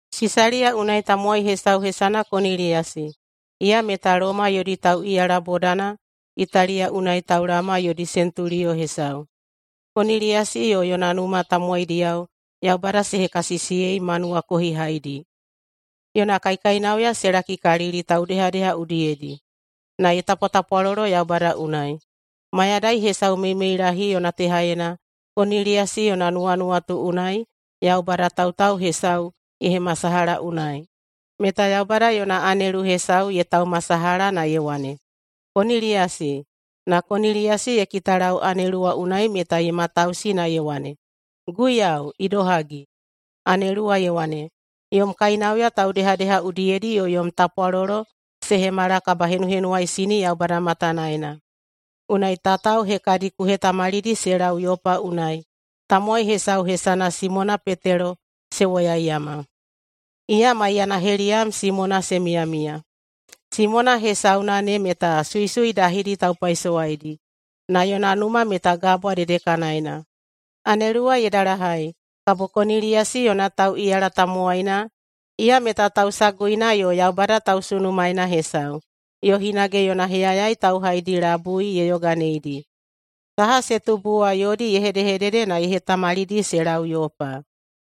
Sisaliya unai tamowai hesau hesana Koniliyasi. Iya meta Loma yodi tauꞌiyala bodana Italiya unai taulaoma yodi sentuliyo hesau. Koniliyasi yo yona numa tamowaidiyao Yaubada se hekasisiyei ma nuwakohihaidi. Yona kaikainauya se lakikalili taudehadeha udiyedi, na ye tapwatapwalolo Yaubada unai. Mayadai hesau meimeilahi yona tehaena Koniliyasi yona nuwanuwatu unai Yaubada tautau hesau ye hemasalaha unai, meta Yaubada yona anelu hesau ye taumasalaha na ye wane, “Koniliyasi!” Na Koniliyasi ye kitalau anelu wa unai meta ye matausi na ye wane, “Guiyau, idohagi?” Anelu wa ye wane, “Yom kainauya taudehadeha udiyedi yo yom tapwalolo se hemala kabahenuhenuwaisini Yaubada matanaena. Unai tatao hekadi ku hetamalidi se lau Yopa unai tamowai hesau hesana Simona Petelo se woyaiyama. Iya maiyana heliyam Simona se miyamiya. Simona hesauna ne meta suisui dahidi taupaisowaidi, na yona numa meta gabwa dedekanaena.” Anelu wa ye dalahai, kabo Koniliyasi yona tauꞌiyala tamowaina, iya meta tausaguina yo Yaubada tausunumaena hesau, yo hinage yona heyayai tauhaidi labui ye yoganeidi. Saha se tubu wa yodi ye hedehedede na ye hetamalidi se lau Yopa.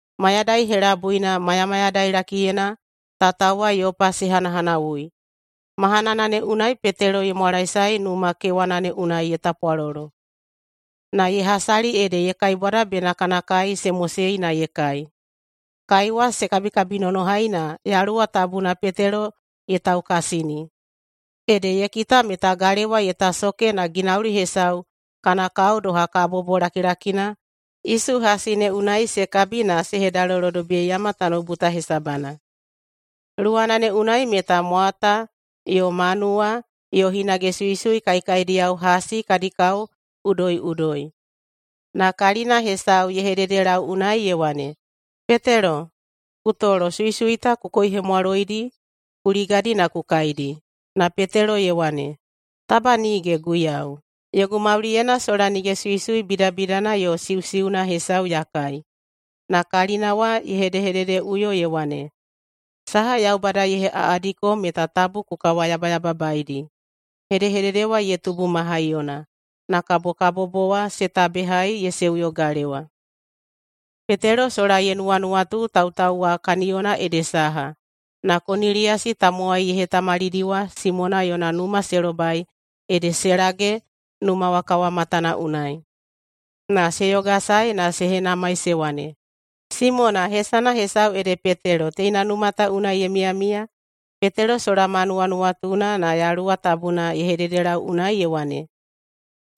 Mayadai helabuina mayamayadailakiyena tatao wa Yopa se hanahanawui. Mahanana ne unai Petelo ye mwalaesae numa kewana ne unai ye tapwalolo. Na ye hasali ede ye kaibwada bena kana kai se mosei na ye kai. Kai wa se kabikabinonohai na Yaluwa Tabuna Petelo ye taukasini. Ede ye kita meta galewa ye tasoke na ginauli hesau kana kao doha kabobo lakilakina isu hasi ne unai se kabi na se hedalolodobiyeiyama tanoubu ta hesabana. Luwana ne unai meta mwata yo manuwa yo hinage suisui kaekaediyao hasi kadi kao udoiꞌudoi. Na kalina hesau ye hededelau unai ye wane, “Petelo, ku tolo! Suisui ta ku koihemwaloidi, ku ligadi na ku kaidi.” Na Petelo ye wane, “Taba nige, Guiyau! Yogu mauliyena sola nige suisui bidabidana yo siusiuna hesau ya kai.” Na kalina wa ye hedehededeꞌuyo ye wane, “Saha Yaubada ye heꞌaꞌadiko meta tabu ku kawayabayababaedi.” Hedehedede wa ye tubu ma haiyona, na kabo kabobo wa se tabehai ye seuyo galewa. Petelo sola ye nuwanuwatu tautau wa kaniyona ede saha, na Koniliyasi tamowai ye hetamalidi wa Simona yona numa se lobai ede se lage numa wa kawamatana unai. Na se yogasae na se henamai se wane, “Simona, hesana hesau ede Petelo, teina numa ta unai ye miyamiya?” Petelo sola ma nuwanuwatuna, na Yaluwa Tabuna ye hededelau unai ye wane,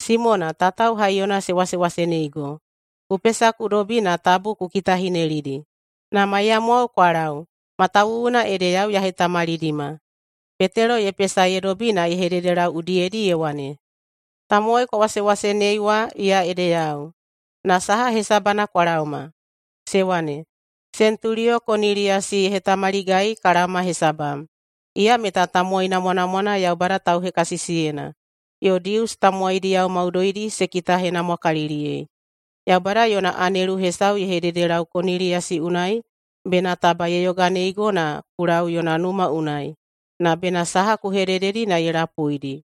“Simona, tatao haiyona se wasewaseneigo. Ku pesa ku dobi na tabu ku kitahinelidi, na maiyamwao kwa lau, matawuwuna ede yau ya hetamalidima.” Petelo ye pesa ye dobi na ye hededelau udiyedi ye wane, “Tamowai kwa wasewasenei wa, iya ede yau. Na saha hesabana kwa laoma?” Se wane, “Sentuliyo Koniliyasi ye hetamaligai ka laoma hesabam. Iya meta tamowai namwanamwana Yaubada tauhekasisiyena, yo Dius tamowaidi maudoidi se kitahenamwakaliliyei. Yaubada yona anelu hesau ye hededelau Koniliyasi unai bena taba ye yoganeigo na ku lau yona numa unai, na bena saha ku hedededi na ye lapuidi.”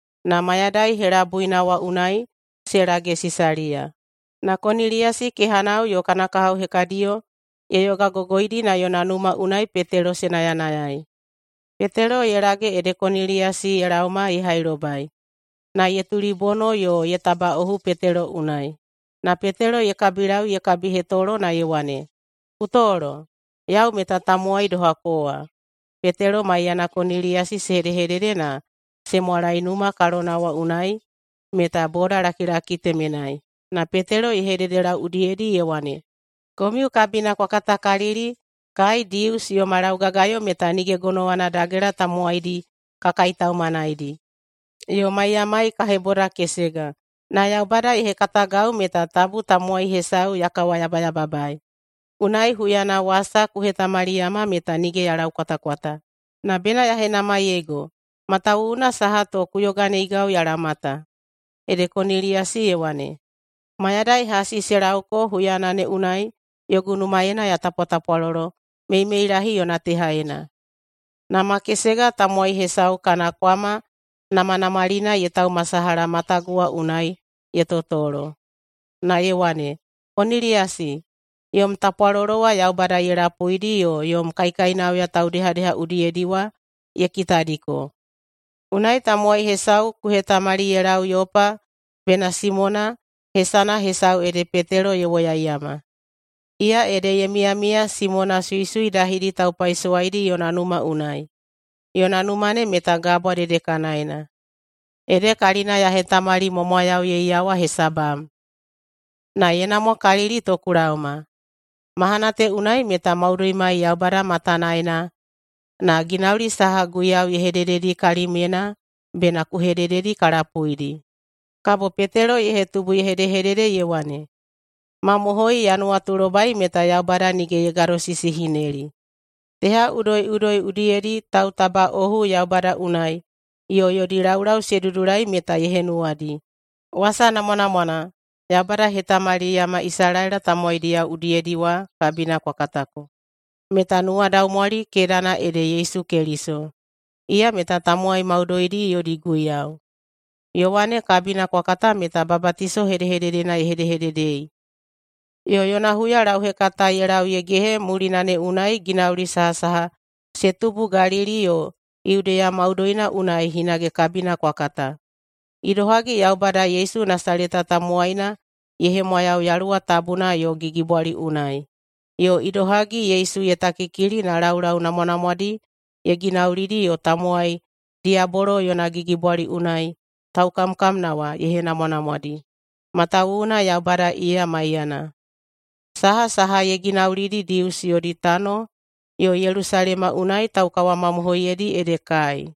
Na mayadai helabuina wa unai se lage Sisaliya. Na Koniliyasi kehanao yo kana kahao hekadiyo ye yogagogoidi na yona numa unai Petelo se nayanayai. Petelo ye lage ede Koniliyasi ye laoma ye hailobai, na ye tulibono yo ye tabaꞌohu Petelo unai. Na Petelo ye kabilau ye kabihetolo na ye wane, “Ku tolo, yau meta tamowai doha kowa.” Petelo maiyana Koniliyasi se hedehedede na se mwalai numa kalona wa unai meta bodalakilaki temenai. Na Petelo ye hededelau udiyedi ye wane, “Komiu kabina kwa katakalili kai Dius yoma laugagayo meta nige gonowana dagela tamowaidi ka kaitaumanaidi yo maiyamai ka hebodakesega. Na Yaubada ye hekatagau meta tabu tamowai hesau ya kawayabayababaei. Unai huyana wasa ku hetamaliyama meta nige ya laukwatakwata. Na bena ya henamaiyeigo matawuwuna saha to ku yoganeigau ya laoma ta.” Ede Koniliyasi ye wane, “Mayadai hasi se lauko huyana ne unai yogu numaena ya tapwatapwalolo meimeilahi yona tehaena, na makesega tamowai hesau kana kwama namanamalina ye taumasalaha matagu wa unai ye totolo na ye wane, ‘Koniliyasi! Yom tapwalolo wa Yaubada ye lapuidi yo yom kaikainauya taudehadeha udiyedi wa ye kitadiko. Unai tamowai hesau ku hetamali ye lau Yopa bena Simona, hesana hesau ede Petelo, ye woyaiyama. Iya ede ye miyamiya Simona suisui dahidi taupaisowaidi yona numa unai. Yona numa ne meta gabwa dedekanaena.’ Ede kalina ya hetamalimwamwayauyeiyawa hesabam, na ye namwakalili to ku laoma. Mahana te unai meta maudoimai Yaubada matanaena, na ginauli saha Guiyau ye hedededi kalimyena bena ku hedededi ka lapuidi.” Kabo Petelo ye hetubu ye hedehedede ye wane, “Mamohoi ya nuwatulobai meta Yaubada nige ye gadosisihineli. Teha udoiꞌudoi udiyedi tautabaꞌohu Yaubada unai yo yodi laulau se dudulai meta ye henuwadi. Wasa namwanamwana Yaubada ye hetamaliyama Isalaela tamowaidiyao udiyedi wa kabina kwa katako, meta nuwadaumwali kedana ede Yesu Keliso. Iya meta tamowai maudoidi yodi Guiyau. Yowane kabina kwa kata meta babatiso hedehededena ye hedehededei. Yo yona huyalauhekata ye lau ye gehe mulina ne unai ginauli sahasaha se tubu Galili yo Yudeya maudoina unai hinage kabina kwa kata: Idohagi Yaubada Yesu Nasaleta tamowaina ye hemwayau Yaluwa Tabuna yo gigibwali unai, yo idohagi Yesu ye takikili na laulau namwanamwadi ye ginaulidi yo tamowai diyabolo yona gigibwali unai taukamkamna wa ye henamwanamwadi, matawuwuna Yaubada iya maiyana. Sahasaha ye ginaulidi Dius yodi tano yo Yelusalema unai tauhemamohoiyedi ede kai.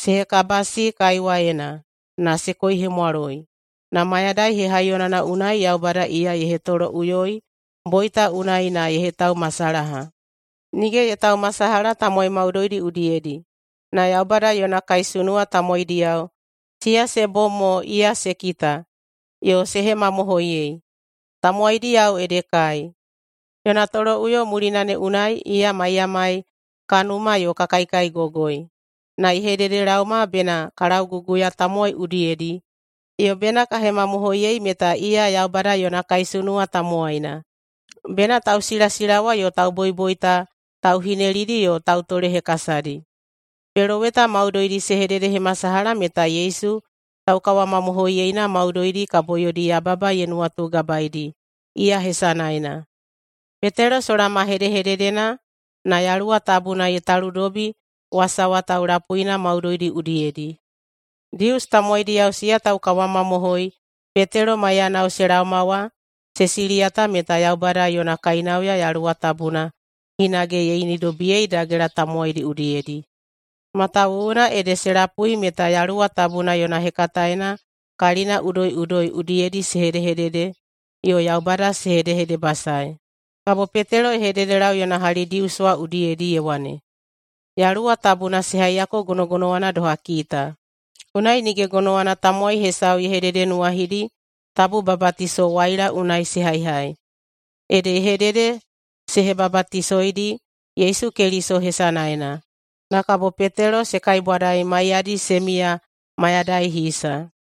Se hekabasi kaiwaena na se koihemwaloi, na mayadai hehaiyonana unai Yaubada iya ye hetoloꞌuyoi boita unai na ye hetaumasalaha. Nige ye taumasalaha tamowai maudoidi udiyedi, na Yaubada yona kaisunuwa tamowaidiyao siya se bom mo iya se kita yo se hemamohoiyei. Tamowaidiyao ede kai, yona toloꞌuyo mulina ne unai iya maiyamai ka numa yo ka kaikaigogoi. Na ye hededelaoma bena ka lauguguya tamowai udiyedi yo bena ka hemamohoiyei meta iya Yaubada yona kaisunuwa tamowaina, bena tausilasilawa yo tauboiboita tauhinelidi yo tautolehekasadi. Peloweta maudoidi se hededehemasalaha meta Yesu taukawamamohoiyeina maudoidi kabo yodi yababa ye nuwatugabaedi iya hesanaena.” Petelo sola ma hedehededena, na Yaluwa Tabuna ye taludobi wasa wa taulapuina maudoidi udiyedi. Dius tamowaidiyao siya taukawamamohoi Petelo maiyanao se laoma wa, se siliyata meta Yaubada yona kainauya Yaluwa Tabuna hinage ye inidobiyei dagela tamowaidi udiyedi, matawuwuna ede se lapui meta Yaluwa yona hekataena kalina udoiꞌudoi udiyedi se hedehedede yo Yaubada se hedehedebasaei. Kabo Petelo ye hededelau [yona hali Dius wa udiyedi] ye wane, “Yaluwa Tabuna se haiyako gonogonowana doha kita. Unai nige gonowana tamowai hesau ye hededenuwahidi tabu babatiso waila unai se haihai.” Ede ye hedede se hebabatisoidi Yesu Keliso hesanaena. Na kabo Petelo se kaibwadai maiyadi se miya mayadai hisa.